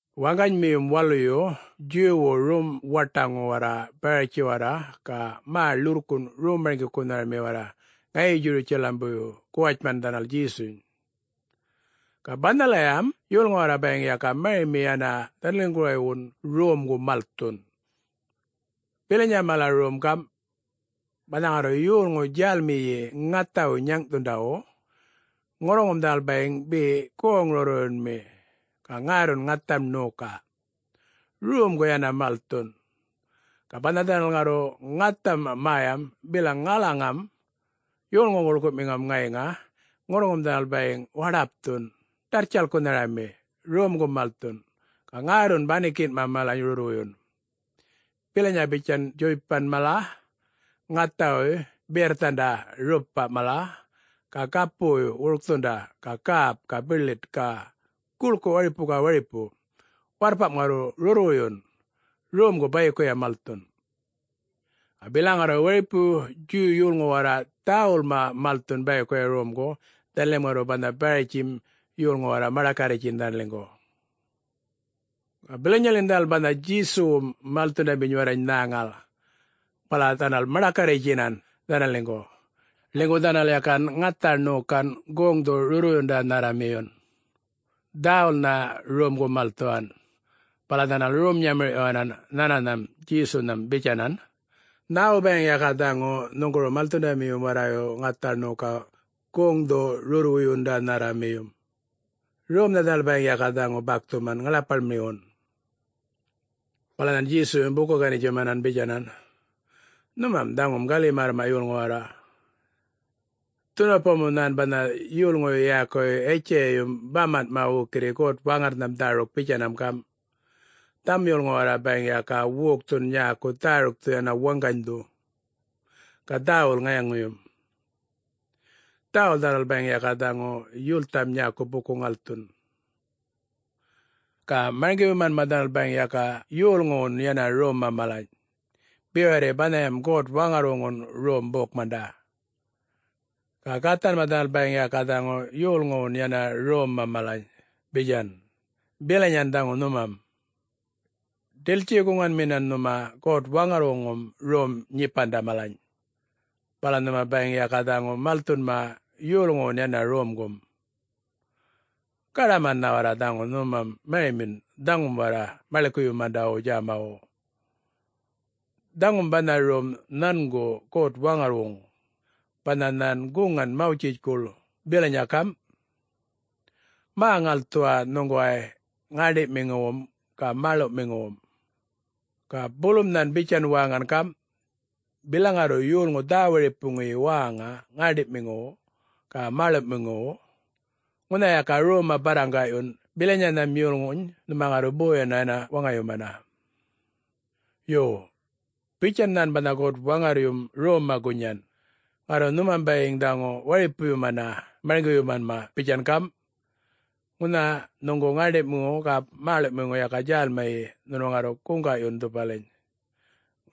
Waŋganymiyum waluyu Djuwwu rom-waṯaŋu warra Baratji warra, ga mä ḻurrkunꞌ rom-marŋgikunhami warra ŋayi Djurutjalambuyyu guwatjman dhanal Djesuny. Ga banhayam yolŋu warra bayiŋ ga marimi yana dhanaliŋguwaywun romgu malthun. Bilanya mala rom gamꞌ: banha ŋarru yolŋu djälmiyi ŋathawu nyaŋꞌthundawu, ŋurruŋum dhanal bayiŋ be goŋ-rurrwuyunmi ga ŋärrun ŋatham ṉoka, romgu yana malthun. Ga banha dhanal ŋarru ŋatham mäyam bilaŋ ŋalaŋam yolŋu guḻkuꞌmiŋam ŋayiŋa, ŋurruŋum dhanal bayiŋ waḏapthun ḏarrtjalkunharami romgu malthun. Ga ŋärrun banikinꞌma malany rurrwuyun, bilanya bitjan djuypanꞌ mala, ŋathawuy biyarrthanda rupa mala, ga gapuwuy wurkthunda ga gäp ga biḻit ga guḻku waripu ga waripu. Warrpamꞌ ŋarru rurrwuyun, romgu bayikuya malthun. Ga bilaŋ ŋarru waripu Djuw yolŋu warra dhäwulma malthun bayikuya romgu, dhanalim ŋarru banha Baratjim yolŋu warra maḏakarritjin dhanaliŋgu. Ga bilanyaḻin dhanal banha Djesuwum malthundaminy warrany nhäŋal, bala dhanal maḏakarritjinan dhanaliŋgu, ḻinygu dhanal yakan ŋatha ṉokan, goŋdhu-rurrwuyundanharramiyun, dhäwulnha romgu malthuwan. Bala dhanal rom-nyamirꞌyuwanan nhananham Djesunham bitjanan, “Nhäwu bayiŋ yaka dhaŋu nhuŋguru malthundamiyum warrayu ŋatha ṉoka goŋdhu-rurrwuyundanharramiyum? Romnha dhanal bayiŋ yaka dhaŋu bakthuman ŋaḻapaḻmiwun!” Bala nhan Djesuyum buku-ganitjuman bitjanan, “Nhumam dhaŋum gali-märrmanꞌ yolŋu warra. Dhunupamu nhan banha yolŋuyu yäkuyu Yitjayayum bamanꞌma wukirri God-Waŋarrnham dhäruk bitjanam gamꞌ, ‘Dhaŋum yolŋu warra bayiŋ yaka wokthun nyäku dhärukthu yana waŋganydhu, ga dhäwul ŋayaŋuyum. Dhäwul dhanal bayiŋ yaka dhaŋu yultham nyäku buku-ŋalthun, ga marŋgiyumanma dhanal bayiŋ yaka yolŋuwun yana romma malany, be warri banham God-Waŋgarrwuŋun rom bokmanda. Ga gathanma dhanal bayiŋ ga dhaŋu yolŋuwun yana romma malany,’ bitjan. Bilanyayan dhaŋu nhumam. Ḏiltji-guŋanminan nhuma God-Waŋarrwuŋum rom-nyipanda malany, bala nhuma bayiŋ yaka dhaŋu malthunma yolŋuwun yana romgum. Gaḏamannha warra dhaŋu nhumam marimin dhaŋum warra maḻikuyumandawum djämawu! Dhaŋum banha rom nhanguŋ God-Waŋarrwuŋ, banha nhan guŋan Mawtjitjkuḻ bilanya gamꞌ, ‘Mä-ŋalthuwa nhuŋguway ŋäṉḏiꞌmiŋuwum ga mäḻuꞌmiŋuwum.’ Ga bulum nhan bitjan wäŋan gamꞌ, ‘Bilaŋ ŋarru yolŋu dhä-waripuŋuyi wäŋa ŋäṉḏiꞌmiŋuwu ga mäḻuꞌmiŋuwu, ŋunha yaka romma barraŋgaꞌyun bilanyanham yolŋuny nhuma ŋarru boyana yana waŋayumana.’ Yo, bitjan nhan banha God-Waŋarryum romma gunyan, ŋarru nhumam bayiŋ dhaŋu waripuyumana marŋgiyumanma bitjana gamꞌ, ‘Ŋunha nhuŋgu ŋäṉḏiꞌmiŋu ga mäḻuꞌmiŋu yaka djälmiyi, nhunu ŋarru guŋgaꞌyun dhupaliny,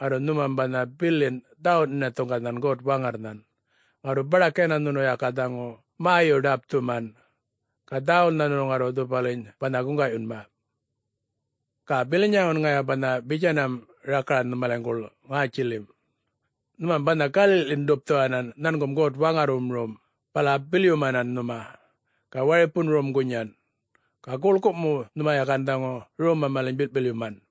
ŋarru nhunum banha bilin dhawuꞌ-nhinathuŋanan God-Waŋarrnhan, ŋarru baḏak yana nhunu yaka dhaŋu mäyu-ḏapthuman, ga dhäwulnha nhunu ŋarru dhupaliny banha guŋgaꞌyunma.’ Ga bilanyawun ŋaya banha bitjanam rakaran nhumaliŋguḻ ŋätjilim, nhumam banha galiꞌḻin-ḏupthuwan nhangum God-Waŋarrwum rom, bala bilyumanan nhuma, ga waripun rom gunyan. Ga guḻku mu nhuma yakan dhaŋu romma malany bilꞌ-bilyuman.’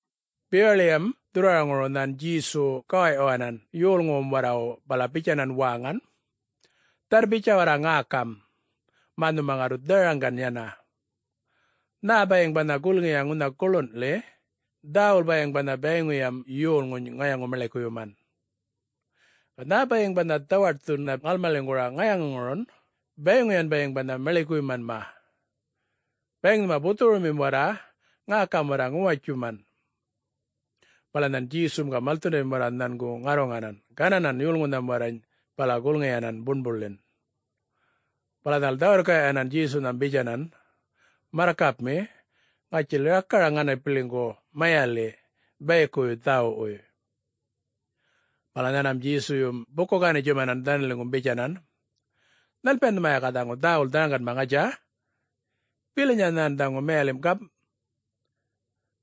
Bewaḻiyam dhurrwaraŋuru nhan Djesu gawawyuwanan yolŋuwum warrawu bala bitjanan wäŋan, “Dharr-bitjan warra ŋäkam, mä nhuma ŋarru dharaŋgan yana. Nhä bayiŋ banha gulŋiya ŋunha guḻunḻi, dhäwul bayiŋ banha bayiŋuyam yolŋuny ŋayaŋu-maḻikuyuman. Ga nhä bayiŋ banha dhawaṯthuna ŋalmaliŋguru ŋayaŋuŋurun bayiŋuyan bayiŋ banha maḻikuyumanma. [Bayiŋ nhuma buthurumim warra, ŋäkam warra ŋuwatjuman!]” Bala nhan Djesum ga malthundamim warra nhangu ŋarruŋanan gananan yolŋunham warrany bala gulŋiyanan buṉbuḻin. Bala dhanal dhä-wirrkaꞌyuwanan Djesunham bitjanan, “Marrkapmi, ŋatjil rakaraŋ ŋanapiliŋgu mayaliꞌ bayikuwuy dhäwuꞌwuy.” Bala nhanmam Djesuyum buku-ganitjuman dhanaliŋgum bitjanan, “Nhalpiyan nhuma yaka dhaŋu dhäwul dharaŋganma, ŋatja? Bilanya nhan dhaŋu mayalimꞌ gamꞌ: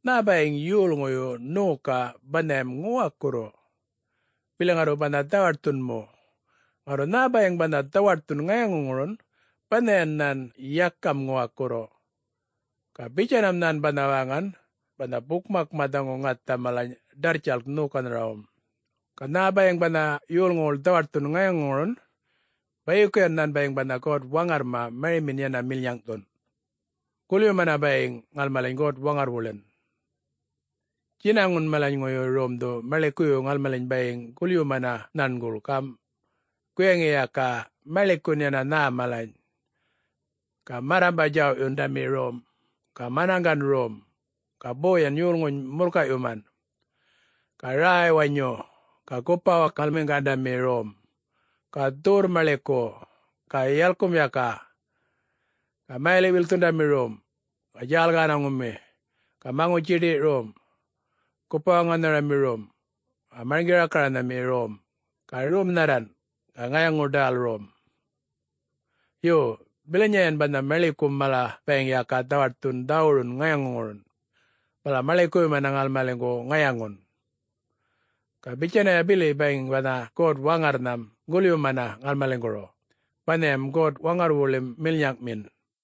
nhä bayiŋ yolŋuyu ṉoka banhayam ŋuwakurru, bili ŋarru banha dhawaṯthun mu. Ŋarru nhä bayiŋ banha dhawaṯthun ŋayaŋuŋurun, banhayan nhän yakam ŋuwakurru.” (Ga bitjanam nhan banha wäŋan, banha bukmakma dhaŋu ŋatha malany ḏarrtjalk ṉokanharawum.) “Ga nhä bayiŋ banha yolŋuwuḻ dhawaṯthun ŋayaŋuŋurun, bayikuyan nhan bayiŋ banha God-Waŋarrma marimin yana milnyaŋꞌthun, gulyumana bayiŋ ŋalmaliny God-Waŋarrwuḻin. Djinaŋun malaŋuyu romdhu maḻikuyu ŋalmaliny bayiŋ gulyumanma nhanguḻ gamꞌ: guyaŋi yaka maḻikun yana nhä malany, ga marrambaꞌ-djawꞌyundami rom, ga manaŋgan rom, ga boyan yolŋuny murrkayꞌyuman, ga räy-wanyuyi, ga gupa-wakalmiŋgandami rom, ga dhuwurr-maḻiku, ga yalkum yaka, ga mayaliꞌ-wilkthundami rom, ga djäl-gänaŋumi, ga maŋutji-ḏiyꞌ rom, gupa-waŋanharami rom, ga marŋgi-rakaranhami rom, ga romnharran, ga ŋayaŋu-ḏäl rom. Yo, bilanyayan banha maḻikum mala bayiŋ yaka dhawaṯthun dhawurum ŋayaŋuŋurum, bala maḻikuyumana ŋalmaliŋgu ŋayaŋun. Ga bitjanaya bili bayiŋ banha God-Waŋarrnham gulyumana ŋalmaliŋguru, banhayam God-Waŋarrwuḻim milnyaŋꞌmin.”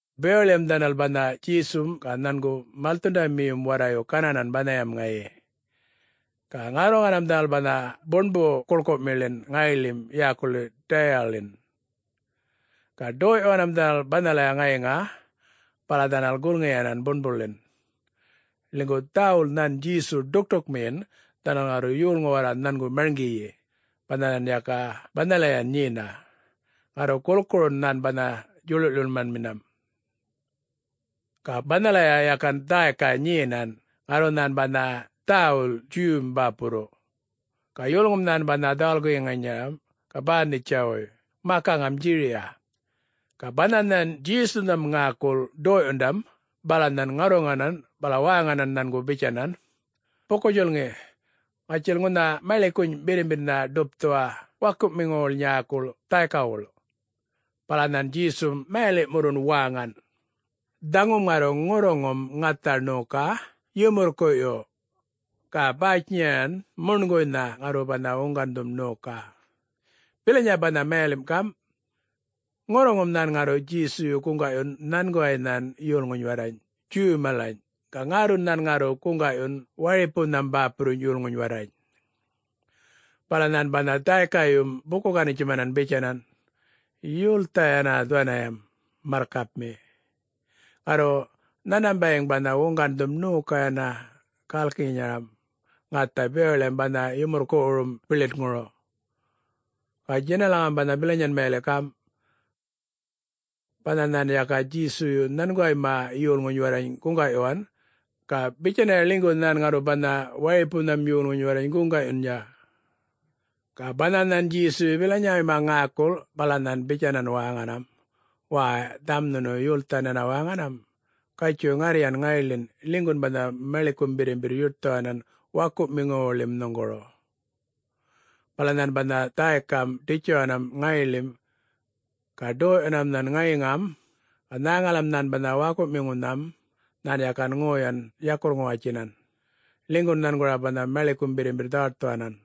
Bewaḻiyam dhanal banha Djesum ga nhangu malthundamiyum warrayu gananan banhayam ŋayi. Ga ŋarruŋanam dhanal banha buṉbu-guḻkumiḻin ŋayiḻim yäkuḻi Däyaḻin. Ga ḏoyꞌyuwan dhanal banhalaya ŋayiŋa bala dhanal gulŋiyanan buṉbuḻin, ḻinygu dhäwul nhan Djesu ḏukṯukmiyin dhanal ŋarru yolŋu warra nhangu marŋgiyi, banha nhan yakan banhalayan nyenan. Ŋarru gulkurun nhan banha djuḻuḻꞌyumanminam. Ga banhalaya yakan dhäyka nyenan ŋarru nhan banha dhäwul Djuw-m bäpurru. Ga yolŋum nhan banha dhawal-guyaŋinyaram ga Bänitjawuy, makaŋam Djiriya. Ga banha nhan Djesunham ŋäkul ḏoyꞌyundam bala nhan ŋarruŋanan bala wäŋanan nhangu bitjanan, “Buku-djulŋi, ŋatjil ŋunha maḻikuny birrimbirrnha ḏupthuwa wakuꞌmiŋuwuḻ nyäkuḻ dhäykawuḻ.” Bala nhan Djesum mayaliꞌmurrun wäŋan, “Dhaŋum ŋarru ŋurruŋum ŋatha ṉoka yumurrkuꞌyu, ga bäytjinyaran muṉguynha ŋarru banha wuŋgandhum ṉoka.” [Bilanya banha mayalimꞌ gamꞌ: ŋurruŋum nhan ŋarru Djesuyu guŋgaꞌyun nhanguway nhan yolŋuny warrany Djuw malany ga ŋärrun nhan ŋarru guŋgaꞌyun waripunham bäpurruny yolŋuny warrany.] Bala nhan banha dhäykayum buku-ganitjuman bitjanan, “Yultha yana dhuwaniyam, marrkapmi. Ŋarru nhanmam bayiŋ banha wuŋgandhum ṉoka yana gälkinyaram ŋatha bewaḻim banha yumurrkuꞌwurum biḻitŋuru.” [Ga djinalaŋam banha bilanyan mayaliꞌ gamꞌ: banha nhan yakan Djesuyu nhanguwayma yolŋuny warrany guŋgaꞌyuwan, ga bitjanaya ḻinygu nhan ŋarru banha waripunham yolŋuny warrany guŋgaꞌyunya.] Ga banha nhan Djesuyu bilanyawuyma ŋäkul bala nhan bitjanan wäŋanam, “Wäy, dhaŋum nhunu yulthan yana wäŋanam. Gatjuy, ŋarryan ŋayiḻin ḻinygun banha maḻikum birrimbirr yuṯthuwanan wakuꞌmiŋuwuḻim nhuŋguru.” Bala nhan banha dhäykam ḏitjuwanan ŋayiḻin. Ga ḏoyꞌyuwanam nhan ŋayiŋam, nhäŋalam nhan banha wakuꞌmiŋunham nhan yakan ŋoyanam yakurr-ŋuwatjinan, ḻinygun nhangura banha maḻikum birrimbirr dhawaṯthuwanan.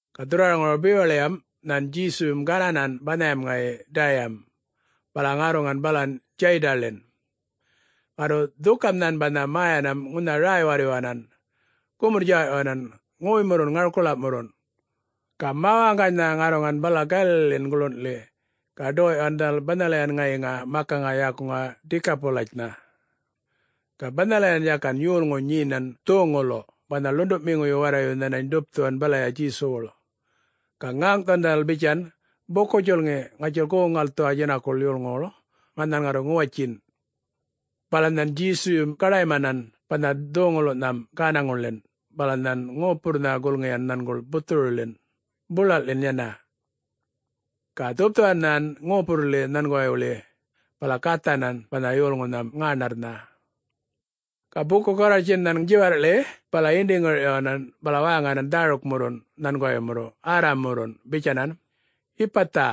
Ga dhurrwaraŋuru bewaḻiyam nhan Djesuyum gananan banhayam ŋayi Däyam, bala ŋarruŋan balan Djäydanḻin, ŋarru dhukam nhan banha mäyanam ŋunha räy-warryuwanan, gumurr-djawꞌyuwan ŋoymurrun ŋarkulaꞌmurrun. Ga mä-waŋganynha ŋarruŋan balan Galaliḻin guḻunḻi ga ḏoyꞌyuwan dhanal banhalayan ŋayiŋa makaŋa yäkuŋa ‘Dikapulitjnha’. Ga banhalayam yakan yolŋu nyenan dhoŋuluꞌ banha ḻunduꞌmiŋuyu warrayu nhanany ḏupꞌthuwan balaya Djesuwuḻ. Ga ŋäŋꞌthuwan dhanal bitjan, “Buku-djulŋi, ŋatjil goŋ-ŋalthuwa djinakuḻ yolŋuwuḻ mä nhan ŋarru ŋuwatjin.” Bala nhan Djesuyum gaḏaymanan banha dhoŋululꞌnham gänaŋuḻin, bala nhan ŋopurrnha gulŋiyan nhanguḻ buthuruḻin, bulalꞌḻin yana. Ga dhupthuwan nhan ŋopurrḻi nhanguwaywuḻi, bala gathanan banha yolŋunham ŋäṉarrnha. Ga buku-garrwartjin nhan djiwarrꞌḻi bala yindi-ŋirꞌyuwanan bala wäŋanan dhärukmurrun nhanguwaymurrun Arram-murrun bitjanan, “Yipatha!”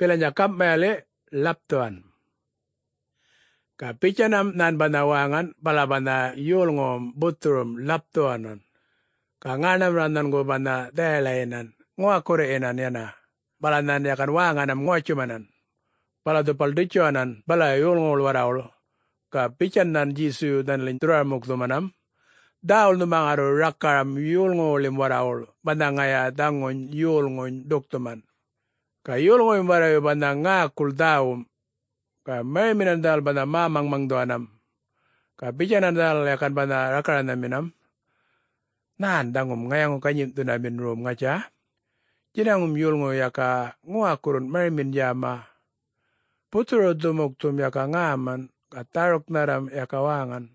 (Bilanya gamꞌ mayaliꞌ, “Ḻapthuwan!”) Ga bitjanam nhan banha wäŋan bala banha yolŋuwum buthurum ḻapthuwanan, ga ŋäṉarrma nhangu banha dhayaḻayinan ŋuwakurruyinan yana, bala nhan yakan wäŋanam ŋuwatjumanan. Bala dhupal ḏitjuwanan balaya yolŋuwuḻ warrawuḻ. Ga bitjan nhan Djesuyu dhanaliny dhurrwara-mukthumanam, “Dhäwul nhuma ŋarru rakaram yolŋuwuḻim warrawuḻ banha ŋaya dhaŋu yolŋuny ḏukthuman.” Ga yolŋuyum warrayu banha ŋäkul dhäwum, ga mariminan dhanal banha mä-maŋmaŋdhuwanam. Ga bitjanan dhanal yakan banha rakaranhaminam, “Nhän dhaŋum ŋayaŋu-ganyimꞌthundamin rom ŋatja! Djinaŋum yolŋuyu yaka ŋuwakurrun marimin djäma. Buthuru-dhumukthum yaka ŋäman ga dhäruknharram yaka wäŋan.”